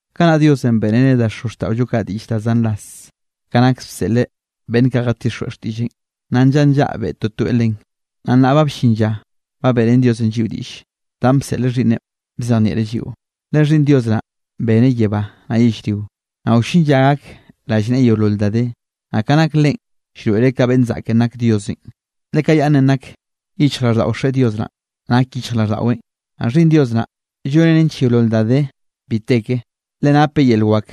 Kanaꞌ Diosenꞌ beꞌreneꞌ da xozxtaꞌollo kaꞌ diꞌll da zan ras, ka nak bseꞌleꞌ beꞌnn kaꞌ jatixjweꞌ xtiꞌlleꞌn, naꞌ nllaꞌa nllaꞌa beꞌe toeꞌ toeꞌ len. Naꞌ nnaꞌ ba bllin lla ba beꞌrén Diosenꞌ lliꞌo diꞌll, danꞌ bseꞌl Xhiꞌnneꞌn bzejnieꞌreꞌ lliꞌo. Le Xhiꞌnn Dios naꞌn beneꞌ yebá naꞌ yellrio. Naꞌ wllin lla gak rallneꞌe yeolol da de. Naꞌ ka nak Leꞌen, llroeꞌreꞌ ka beꞌnn zaꞌken nak Diosenꞌ, le ka yaꞌnnenꞌ nak yichjraꞌlldaꞌo Xeꞌe Dios naꞌn, nak yichjraꞌlldaꞌweꞌn. Naꞌ Xhiꞌnn Dios naꞌ, lloneꞌ nench yeolol da de bi te ke, le napeꞌ yel wak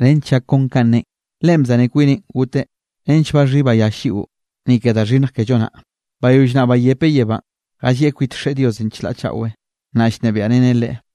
nench llak kon ka neꞌen. Leꞌen bzaneꞌ kwineꞌ goteꞌ nench baxhí bayall lliꞌo, ni ke da xhinnj kello naꞌ. Bayoll naꞌ bayepeꞌ yebánꞌ, jallieꞌ kwit Xeꞌe Diosenꞌ chlaꞌ chaꞌwe, naꞌ llnebiaꞌreneꞌ Leꞌe.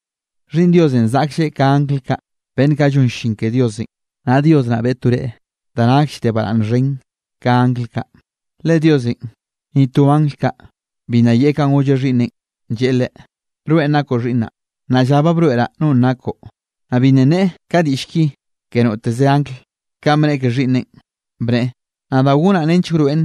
Xhiꞌnn Diosenꞌ zaꞌklleꞌ ka angl kaꞌ, beꞌnn kaꞌ llon llin ke Diosenꞌ; naꞌ Dios naꞌ beꞌe to reꞌe da nakll de baraꞌnne xhen ka angl kaꞌ. Le Diosenꞌ, ni to angl kaꞌ, bi nna yeꞌe kanꞌ golleꞌ Xhiꞌnneꞌn, lleꞌe Leꞌe: Rweꞌ nakoꞌ Xhiꞌnnaꞌ; nnaꞌ lla ba broeꞌraꞌ nonꞌ nakoꞌ. Naꞌ bi nna nneꞌe ka diꞌll ki ke noteze angl, kanꞌ bneꞌe ke Xhiꞌnneꞌn, bneꞌe: Nadaꞌ gonaꞌ nench wroeꞌn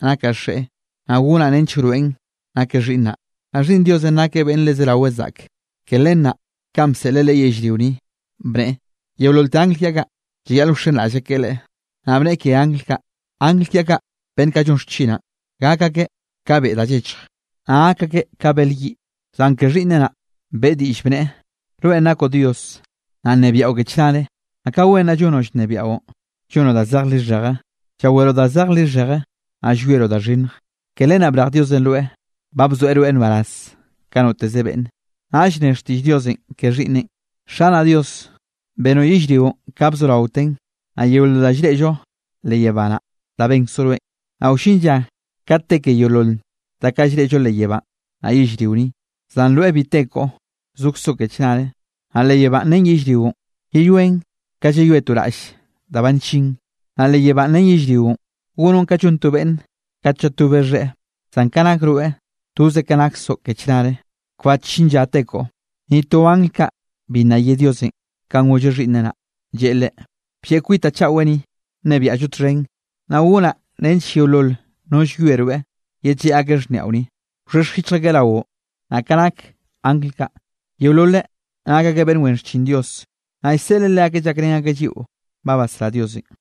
nakaꞌ Xeꞌe, naꞌ gonaꞌ nench wroeꞌn nakeꞌ Xhiꞌnnaꞌ. Naꞌ Xhiꞌnn Diosenꞌ nakeꞌ beꞌnn le zerawe zaꞌke. Ke len naꞌ kanꞌ bseꞌleꞌ Leꞌe yellrio ni, bneꞌe: Yeololte angl kiaꞌ kaꞌ, llayaꞌl wxenraꞌll akeꞌ Leꞌe. Naꞌ bneꞌe ke angl kaꞌ: Angl kiaꞌ kaꞌ beꞌnn kaꞌ llon xchinaꞌ, gak akeꞌ ka beꞌ da llechj, naꞌ gak akeꞌ ka bel yiꞌ. Zan ke Xhiꞌnneꞌ naꞌ beꞌe diꞌll, bneꞌe: Rweꞌn nakoꞌ Dios, naꞌ nnebiaꞌo ke chnare. Naꞌ ka wen naꞌ llonoꞌ llnebiaꞌon, llonoꞌ da zej lixheje. Llaweroꞌ da zej lixheje, naꞌ llwieroꞌ da xhinnj. Ke len naꞌ brej Diosenꞌ rweꞌ, ba bzoeꞌ rweꞌ nbaraz ka noteze beꞌnne. Naꞌll ne xtiꞌll Diosenꞌ ke Xhiꞌnneꞌn: Xanaꞌ Dios, benoꞌ yellrionꞌ ka bzoraotenꞌ, naꞌ yeolol danꞌ llreꞌllo leꞌ yebá naꞌ, da benkzoꞌ rweꞌn. Naꞌ wllin lla kate te ke yeolol da kaꞌ llreꞌllo leꞌ yebánꞌ, naꞌ yellrio ni, zan rweꞌ bi te koꞌo, zokzoꞌ ke chnare. Naꞌ leꞌ yebánꞌ ren yellrionꞌ, yeyoen ka llayoe to raꞌll da ba nllin. Naꞌ leꞌ yebánꞌ ren yellrionꞌ, gonoꞌn ka llon to beꞌnne kat llatobe xheꞌe. Zan ka nak rweꞌ, toze ka naksoꞌ ke chnare, kbat llin lla te koꞌo. Ni to angl kaꞌ, bi nna ye Diosenꞌ kanꞌ golleꞌ Xhiꞌnneꞌ naꞌ, lleꞌe Leꞌe: Blleꞌ kwitaꞌ chaꞌwe ni, nnebiaꞌllo txhen, naꞌ gonaꞌ nench yeolol no llwie rweꞌ, yedlleꞌ akeꞌ xhniaꞌo ni, wxhexj yichj akeꞌ raoꞌ. Naꞌ ka nak angl kaꞌ, yeololeꞌ nak akeꞌ beꞌnn wen xchin Dios, naꞌ llseꞌleꞌ leakeꞌ llakrén akeꞌ lliꞌo ba basrá Diosenꞌ.